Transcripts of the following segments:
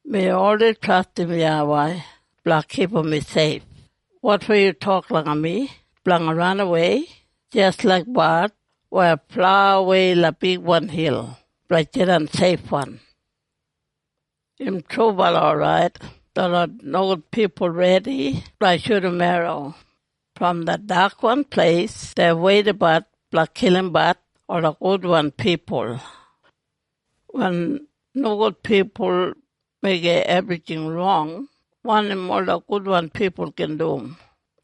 Mi oldei trastim YAWEI blanga kipum mi seif. Wotfo yu tok langa mi blanga ranawei jis laik bard weya flaiwei langa bigwan hil blanga jidan seifwan? Im trubala orait, detlot nogud pipul redi blanga shudum garram bo en erro. Brom det dakwan pleis dei weidabat blanga kilimbat ola gudwan pipul. Wen nogudbala pipul meigim ebrijing rong, wanim ola gudwan pipul gin dum?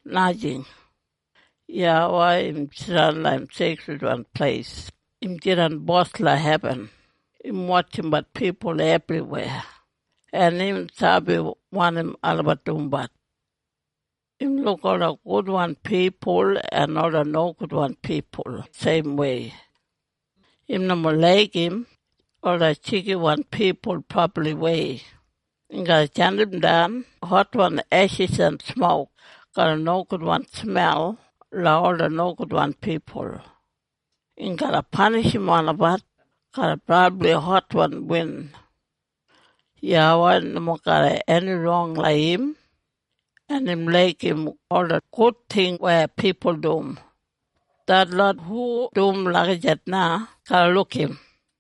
Najing! YAWEI, im jidan langa im seikridwan pleis. Im jidan bos langa hebin. Im wotjimbat pipul ebriweya en im sabi wanim olabat dumbat. Im luk ola gudwan pipul en ola nogudwan pipul seimwei. Im nomo laigim ola jigiwan pipul brabliwei. Im garra jandimdan hotwan eshis en smok garram nogudwan smel langa ola nogudwan pipul. Im garra panishim olabat garram brabli hotwan win. YAWEI nomo garram eni rong langa im, en im laigim ola gud ting weya pipul dum. Detlot hu dum lagijat na garra luk im.